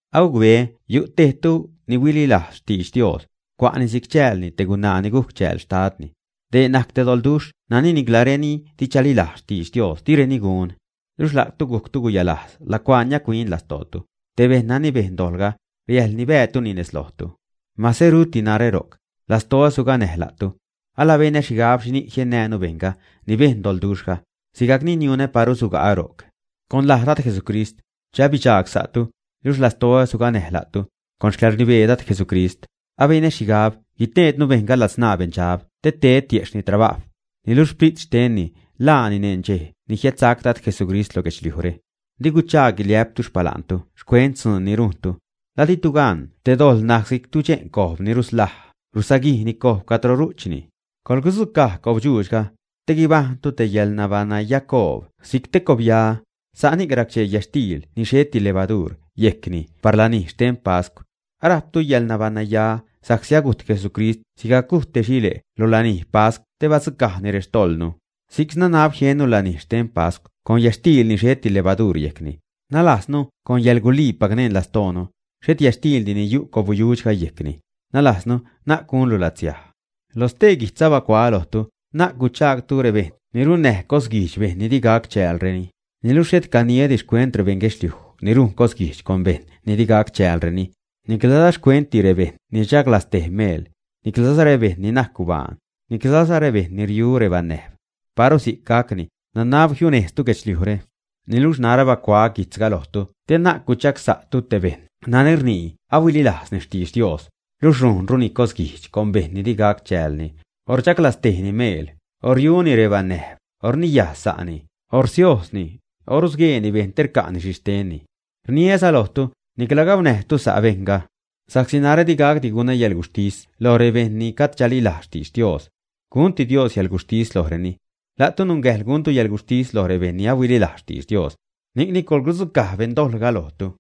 Agucbeä yu' tejtu ni ahuililajz xtidx Dios, cua'ni si'c chäälni te gunaa ni gujc chääl xtadni. Dee najc te doḻduxh nani nicla reni di chalilajz xtidx Dios direni gun. Luxh la'tu gujctu guyalajz lacuaa niac-huin lastootu; te bejṉ nani bejn dojḻga, riäjl nibäätuni nez lojtu. Mase ruti narä ro'c, lastoä suganäj la'tu. Alabenä xhigab xhini'c jiennäjnu bejṉga ni bejn doḻduxhga, sigajc ni niunä paru suga'ä ro'c. Con laj Dad Jesucrist, che abidxagsa'tu, luxh alastoä suganäj la'tu, con xcäḻrnibee Dad Jesucrist, abenä xhigab guteednu bejṉga ladzṉaa beṉdxab te ted tiejxhni trabajw, niluxh sprit xtenni ḻaani neṉ dxej ni jiädsac Dad Jesucrist lo guedxliujre. Di guchaag guiliä'ptu xpala'ntu xcuent dzuun ni rujntu. ¿La ditu gan te dojḻ najc si'c tudxe'n cojb ni ruslaj, rusaguijni cojb cadro ru'chni, ä? Coḻgudzucaj cobyujxhga, te guibajṉtu te yäḻnabaṉnayacoob si'c te cobya, sa'ni racchee yätxtiil ni xheti levaduur yejcni par lanij xten pascw. Arajptu yäḻnabaṉnaya sa'csi agujt Jesucrist sigajc gujt te xile' lo lanij pascw te badzucajni rextojḻnu. Si'c nanab jiennu lanij xten pascw con yätxtiil ni xheti levaduur yejcni, nalajznu con yäḻguliipac neṉ lastoonu, xhet yätxtiildi ni yu' cobyujxhga yejcni, nalajznu na'c gunlu latsiaj. Lo stee guijtz abacuaä lojtu, na'c guchaagtu rebeṉ ni runnäj cosguijdx bejṉ ni di gac chäälreni. Niluxh xhet caniädi xcuent rebeṉ guedxliuj ni rujn cosguijdx con bejṉ ni di gac chäälreni, niclaza xcuentdi rebejṉ ni rchaglaztej meel, niclaza rebejṉ ni najc gubaan, niclaza rebejṉ ni riu rebanäjb. Paru si'c gacni, nanab jiunejztu guedxliujre. Niluxh narä bacuaä guijtzga lojtu te na'c guchagsa'tu te bejṉ nani rnii ahuililajzni xtidx Dios, luxh rujnruni cosguijdx con bejṉ ni di gac chäälni, o rchaglaztejni meel, o riuni rebanäjb, o rniyaj sa'ni, o rsiojzni, o rusgueeni bejṉ te rca'ni xhi xtenni. Rniäza lojtu, nicla gaunäjtu sa' bejṉga. Sa'csi narä di gacdi gunä yäḻguxhtis loj rebejṉ ni gajd chalilajz xtidx Dios. Gunti Dios yälguxhtis lojreni. La'tu nungäjḻ guntu yälguxhtis loj rebejṉ ni ahuililajz xtidx Dios. Ni'cni coḻgudzucaj beṉdojḻga lojtu.